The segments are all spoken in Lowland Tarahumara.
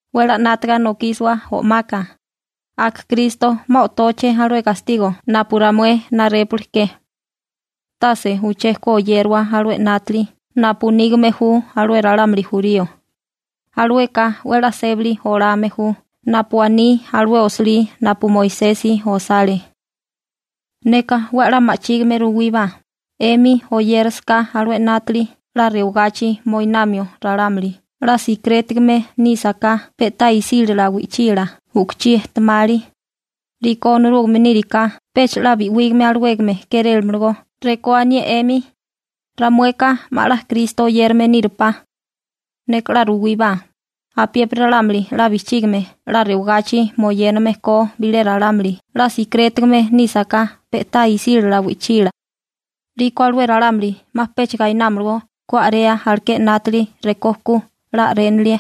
'We 'la 'nátaga nokísiwa o'maka. Aka Kristo 'ma o'tóché alué gastigo napu ramué narépuliké. Tase uché ku oyériwa alué 'nátili napu nígame ju alué ralámuli jurío, alueka 'we 'la sébali olame ju napu aní alué osilí napu Moisesi osale. Neka 'we 'la ma'chígime ruwíbá, 'emi oyérasaká alué 'nátili 'la rewagachi moinamio ralámuli 'la sikirétigame nísaká pe'tá isílala wi'chila u'kuchí ejtemali, 'liko Onorúgame níriká pecha 'la bi'wígame alawégame kérélamalagó rekó anié 'emi: «Ramueka 'ma 'la Kristo oyérame nírupá.» Neka 'la ruwíbá, apiépiri ralámuli 'la bijchígame 'la rewagachi moyéname ko bilé ralámuli 'la sikirétigame nísaká pe'tá isílala wi'chila, 'liko alué ralámuli 'ma pecha gainámalagó ku a'rea alaké 'nátili rekó ku 'la a'rénilie.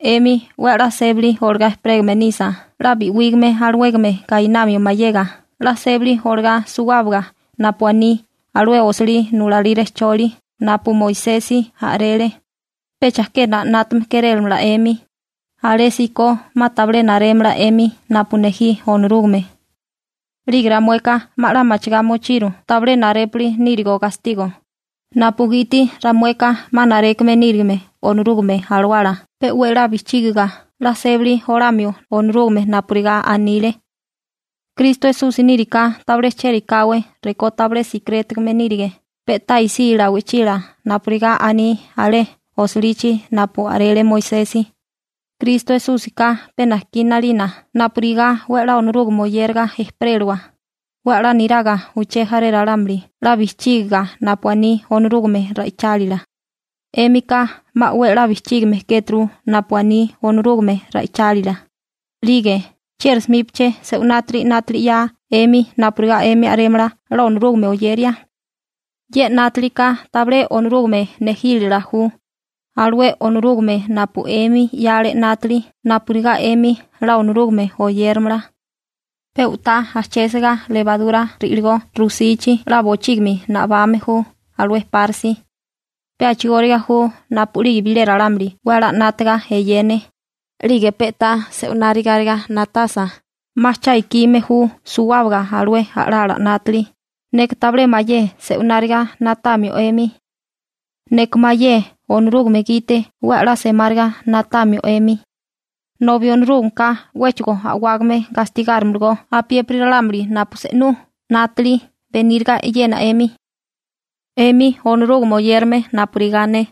'Emi 'we 'la sébali olagá ejperégame nisa 'la bi'wígame alawégame gainamio mayega 'la sébali olagá suwábaga napu aní alué osilí nulalí rejcholi napu Moisesi a'rele, pe chajkena 'nátame kérélamala 'emi, alésíko 'ma tabilé narémala 'emi napu nejí Onorúgame. 'Lige ramueka 'ma 'la machigá mochiru tabilé narépuli nírigo gastigo, napugiti ramueka 'ma narékame nírigime Onorúgame Alawala pe 'we 'la bijchígiga 'la sébali olamio Onorúgame napurigá anile. Kristo Esusi níriká tabilé chérikáwé rekó tabilé sikirétigame nírige pe'tá isílala wi'chila napurigá aní alé osilichi napu a'rele Moisesi. Kristo Esúsika pe najkí 'nalina napurigá 'we 'la Onorúgame oyéraga ejperélawa, 'we 'la niraga uché jaré ralámuli 'la bijchígiga napu aní Onorúgame ra'ichálila. 'Émika 'ma 'we 'la bijchígime kéturu napu aní Onorúgame ra'ichálila. 'Lige ¿chieri 'smíbaché se'winátiri 'nátili 'ya 'emi napurigá 'emi a'rémala 'la Onorúgame oyeria? Ye 'nátilika tabilé Onorúgame nejílala ju, alué Onorúgame napu 'emi 'yale 'nátili napurigá 'emi 'la Onorúgame oyéramala. Pe u'tá ajchésiga lebarura ri'ligó rusichi 'la bochígimi nabame ju alué párisi. Pe a'chigóriga ju napu'lige bilé ralámuli 'we 'la 'nátaga eyene, 'lige pe'tá se'winárigariga na'tasa, 'ma cha ikime ju suwábaga alué a'lala 'nátili. Neka tabilé mayé se'wináriga na'tamio 'emi. Neka mayé Onorúgame gite 'we 'la semáriga na'tamio 'emi. Nobi Onorúgameka 'wéchigo a'wágame gastigárimalagó apiépiri ralámuli napu se'nú 'nátili beníriga eyena 'emi. 'Emi Onorúgame oyérame napurigá ne,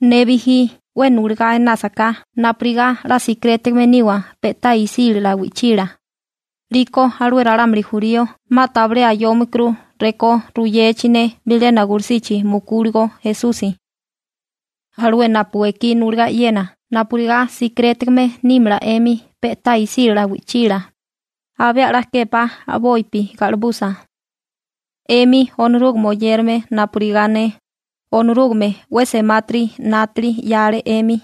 ne bijí 'we nuligá enásaká napurigá 'la sikirétigame niwa pe'tá isílala wi'chila, 'liko alué ralámuli jurío 'ma tabilé ayómikuru rekó ruyechi ne bilena gulusichi mukúligo Esusi. Alué napu ekí nulagá e'yena napurigá sikirétigame nímala 'emi pe'tá isílala wi'chila, abé 'la kepa a'bopi ga'libusa. 'Emi Onorúgame oyérame napurigá ne, Onorúgame 'we semátiri 'nátili 'yale 'emi,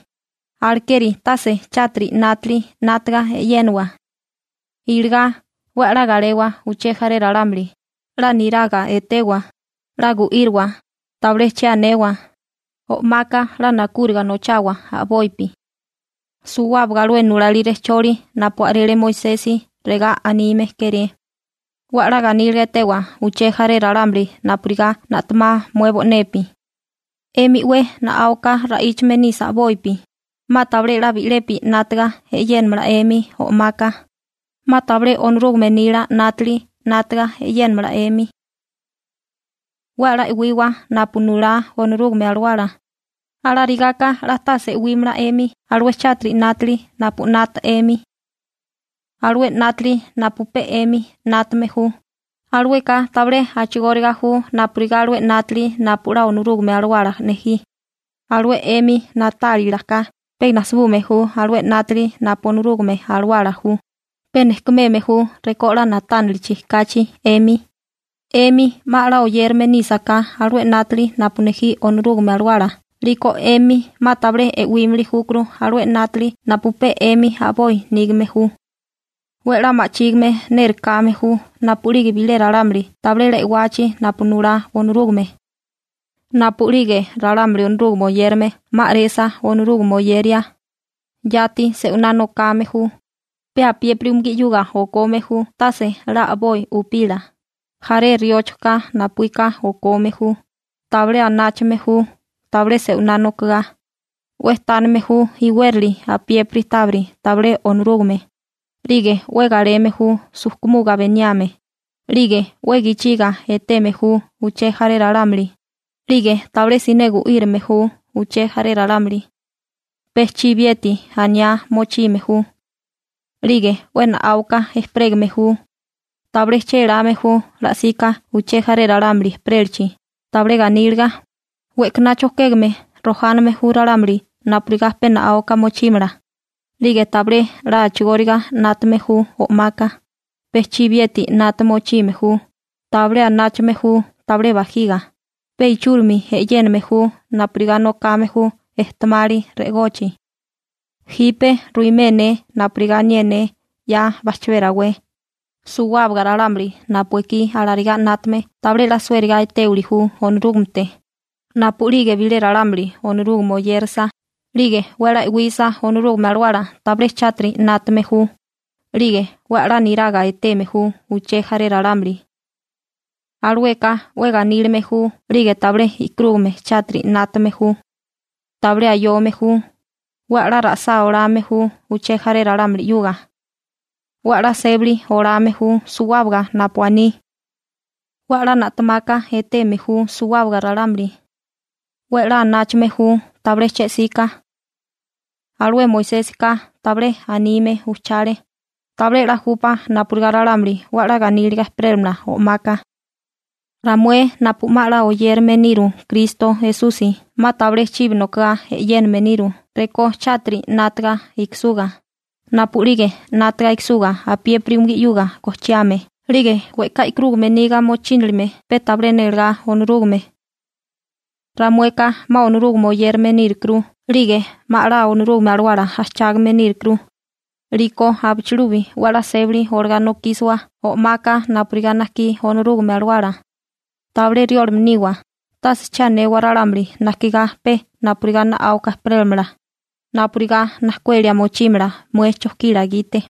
alekeri tase chátiri 'nátili 'nátaga e'yénawa. Iligá 'we 'la galewa uché jaré ralámuli, 'la niraga etewa, 'la gu'íriwa, tabilé che anewa, o'maka 'la nakúriga nochawa a'bopi. Suwábaga alué nulalí rejcholi napu a'rele Moisesi regá anime kéré: «'We 'la ganíliga etewa uché jaré ralámuli napurigá na'temá mué bo'nepi.» 'Emi 'we na'áuka ra'íchame nisa a'bopi, 'ma tabilé bi'lepi 'nátaga e'yénamala 'emi o'maka, 'ma tabilé Onorúgame nila 'nátili 'nátaga e'yénamala 'emi. 'We 'la e'wiwa napu nulá Onorúgame Alawala, alarigaka 'la tase e'wímala 'emi alué chátiri 'nátili napu 'nata 'emi. Alué 'nátili napu pe 'emi 'nátame ju, alueka tabilé a'chigóriga ju napurigá alué 'nátili napu 'la Onorúgame Alawala nejí, alué 'emi na'tálilaká pe najsibume ju alué 'nátili napu Onorúgame Alawala ju, pe nejkumeme ju rekó 'la na'tánilichi kachi 'emi. 'Emi 'ma 'la oyérame nísaká alué 'nátali napu nejí Onorúgame Alawala 'liko 'emi 'ma tabilé e'wémili júkuru alué 'nátili napu pe 'emi a'boi nígame ju. 'We 'la ma'chígime nérekáme ju napu'lige bilé ralámuli tabilé 'la e'wachi napu nulá Onorúgame. Napu'lige ralámuli Onorúgame oyérame 'ma a'resa Onorúgame oyeria, yati se'winá nokame ju, pe apiépiri umugí 'yuga okome ju tase 'la a'boi upila, jaré rióchoká napuíka okome ju, tabilé anáchame ju tabilé se'winá nokogá, 'we tánime ju iwérali apiépiri tábiri tabilé Onorúgame, 'lige 'we galeme ju sujkumuga beniame, 'lige 'we gichiga eteme ju uché jaré ralámuli, 'lige tabilé siné gu'írame ju uché jaré ralámuli, pe chibiyeti aniá mochime ju, 'lige 'we na'áuka ejperégame ju, tabilé chéláme ju la'sika uché jaré ralámuli ejperélachi, tabilé ganíliga, we'kaná chojkégame rojáname ju ralámuli napurigá pe na'áuka mochímala, 'lige tabilé 'la a'chigóriga 'nátame ju o'maka, pe chibiyeti 'nata mochime ju, tabilé anáchame ju tabilé bajiga, pe ichúrimi e'yéname ju napurigá nokame ju ejtemali re'egochi. Jipe ruimé ne napurigá anié ne 'ya bajchabé rawé: Suwábaga ralámuli napu ekí alarigá 'nátame tabilé 'la suériga etéwili ju Onorúgamete. Napu'lige bilé ralámuli Onorúgame oyérasa, 'lige 'we 'la e'wisa Onorúgame Alawala tabilé chátiri 'nátame ju, 'lige 'we 'la niraga eteme ju uché jaré ralámuli. Alueka 'we ganílime ju 'lige tabilé e'karúgame chátiri 'nátame ju. Tabilé ayome ju, 'we 'la ra'sá olame ju uché jaré ralámuli 'yuga. 'We 'la sébali olame ju suwábaga napu aní. 'We 'la na'temaka eteme ju suwábaga ralámuli. 'We 'la anáchame ju tabilé che'sika. Alué Moisésika tabilé anime ujchale: «Tabilé 'la júpá napurigá ralámuli 'we 'la ganíliga ejperélamala o'maka.» Ramué napu 'ma 'la oyérilime niru Kristo Esusi 'ma tabilé chibi nokigá e'yéname niru rekó chátiri 'nátaga ikisuga, napu'lige 'nátaga ikisuga apiépiri umugí 'yuga gojchiame 'lige we'ká e'karúgame niga mochínilime pe tabilé nélegá Onorúgame. Ramueka 'ma Onorúgame oyérame nírukuru 'lige 'ma 'la Onorúgame Alawala ajchágame nírukuru, 'liko abichilubi 'we 'la sébali olagá nokísiwa o'maka napurigá najkí Onorúgame Alawala. Tabilé riólame niwa, tase che anewa ralámuli najkigá pe napurigá na'áuka ejperélamala, napurigá najkuelia mochímala mué chojkila gite.